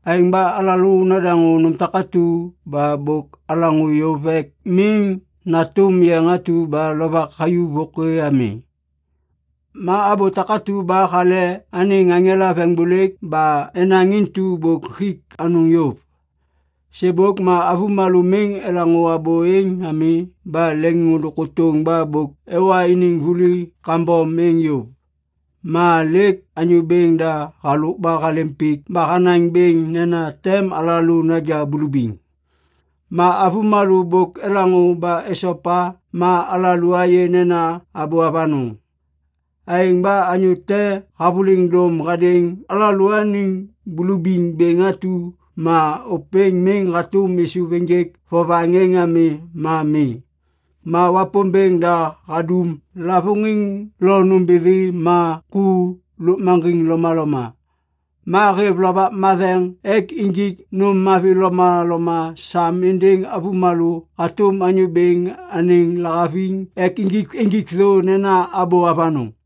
Aêŋ ba alalô nadaŋô nôm takatu ba bôk alaŋô yôv ek miŋ natôm yeŋ atu ba lovak hayuv vôkê ami. Ma abô takatu ba hale anêŋ aŋela veŋiŋbôlêk ba enaŋ intu bôk hik anôŋ yôv. Sêbôk ma avômalô miŋ elaŋô abô êŋ ami ba leŋôndôŋ kôtôŋ ba bôk ewa iniŋ vuli kambom êŋ yôv. Ma lêk Anyô Bêŋ da halôk ba halêm pik ba hanaŋ bêŋ nena tem alalô naja bulubiŋ. Ma avômalô bôk elaŋô ba esopa ma alalô ayê nena abô avanôŋ. Aêŋ ba anyô te havôliŋ dôm hadêŋ alalôaniŋ bulubiŋ bêŋ atu ma ôpêŋ miŋ hatôm êsôv ênjêk vovaŋ êŋ ami ma mi. Ma Wapômbêŋ da hadum lavôŋiŋ lo nômbithi ma ku lôkmaŋgiŋ lomaloma. Ma hêv Lovak Matheŋ ek injik nôm mavi lomaloma sam êndêŋ avômalô hatôm Anyô Bêŋ anêŋ lahaviŋ ek injik thô nena abô avanôŋ.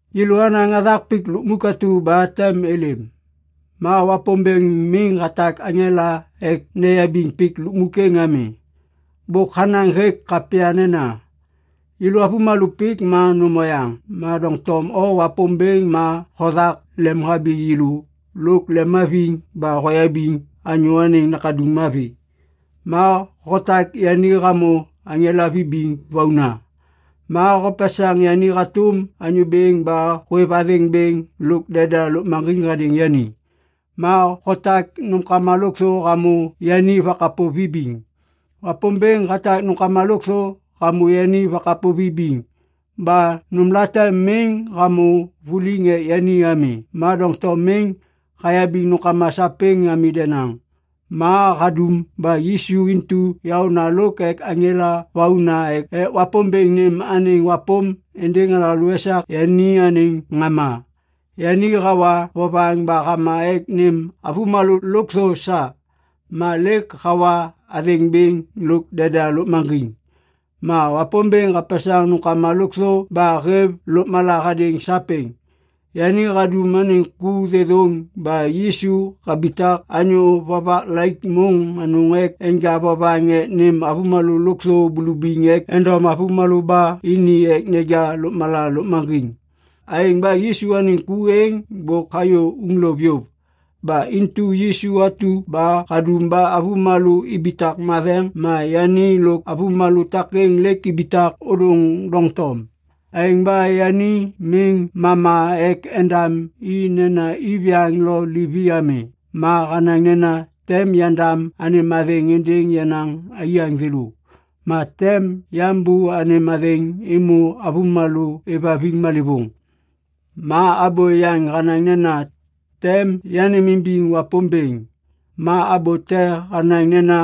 Yêlô anaŋ hathak pik lukmuk atu ba tem êlêm. Ma Wapômbêŋ miŋ hatak aŋela ek neyabiŋ pik lukmuk êŋ ami. Bôk hanaŋ hêk kapya nena, “Yêlô avômalô pik ma nôm oyaŋ. Ma doŋtom O Wapômbêŋ ma hothak lemhabi yêlô lôk lemhaviŋ ba hoyabiŋ anyô anêŋ nakaduŋ mavi. Ma hotak yani hamô aŋela vibiŋ vauna, ma hopesaŋ yani hatôm anyô bêŋ ba hôêv athêŋ bêŋ lôk deda lôkmaŋgiŋ hadêŋ yani, ma hotak nômkama lôkthô hamô yani vakapô vibiŋ.” Wapômbêŋ hatak nômkama lôkthô hamô yani vakapô vibiŋ. Ba nômlate miŋ hamô vuliŋ ek yani ami. Ma doŋtom miŋ hayabiŋ nômkama sapêŋ ami denaŋ. Ma hadum ba Yisu intu yaôna lôk ek aŋela vauna ek Wapômbêŋ nêm anêŋ wapôm êndêŋ alalô esak yani anêŋ ŋama. Yani hawa vovaŋ ba hama ek nêm avômalô lôkthô sa. Ma lêk hawa athêŋ bêŋ lôk deda lôkmaŋgiŋ. Ma Wapômbêŋ hapesaŋ nômkama lôkthô ba hêv lôkmala hadêŋ sapêŋ. Yani hadum anêŋ ku thêthôŋ ba Yisu habitak anyô vovak laik môŋ anôŋ ek enja vovaŋ ek nêm avômalô lôkthô bulubiŋ ek endom avômalô ba ini ek neja lôkmala lôkmaŋgiŋ. Aêŋ ba Yisu anêŋ ku êŋ bôk hayô uŋlôv yôv. Ba intu Yisu atu ba hadum ba avômalô ibitak matheŋ ma yani lôk avômalô takêŋ lêk ibitak ôdôŋ doŋtom. Aêŋ ba yani miŋ mama ek endam i nena iviyaŋ lo livi ami ma hanaŋ nena, “Tem yandam anêm athêŋ êndêŋ yenaŋ aiyaŋ thêlô, ma tem yambô anêm athêŋ êmô avômalô êvhaviŋ malêvôŋ.” Ma abô yaŋ hanaŋ nena, “Tem yanêmimbiŋ Wapômbêŋ.” Ma abô te hanaŋ nena,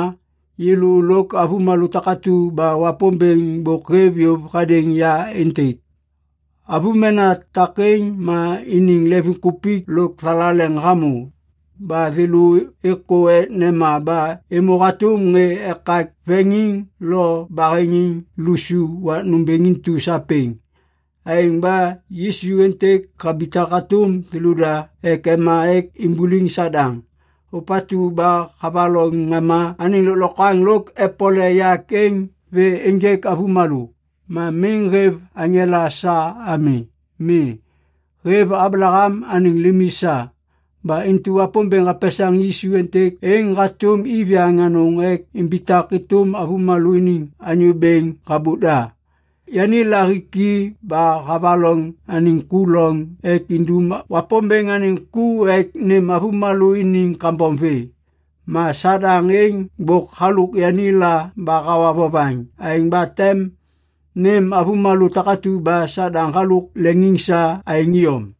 “Yêlô lôk avômena takatu ba Wapômbêŋ bôk hêv yôv hadêŋ ya êntêk.” Avômena takêŋ ma iniŋ leŋviŋkupik lôk thalaleŋ hamô. Ba thêlô êkô ek nema ba êmô hatôm ŋê ekak veŋiŋ lo baheŋiŋ lusu wak nômbêŋ intu sapêŋ. Aêŋ ba Yisu êntêk habitak hatôm thêlôda ek ema ek imbuliŋ Sadaŋ, ôpatu ba havaloŋ ŋama anêŋ lôklokwaŋ lôk epole yak êŋ vê ênjêk avômalô. Ma miŋ hêv aŋela sa ami. Mi. Hêv Ablaham anêŋ limi sa. Ba intu Wapômbêŋ hapesaŋ Yisu êntêk êŋ hatôm iviyaŋ anôŋ ek imbitak êtôm avômalô iniŋ anyô bêŋ habôk da. Yani lahiki ba havaloŋ anêŋ ku loŋ ek indum Wapômbêŋ anêŋ ku ek nêm avômalô iniŋ kambom vê. Ma Sadaŋ êŋ bôk halôk yani la ba hawa vovaŋ. Aêŋ ba tem nêm avômalô takatu ba Sadaŋ halôk leŋiŋ sa aêŋ iyom.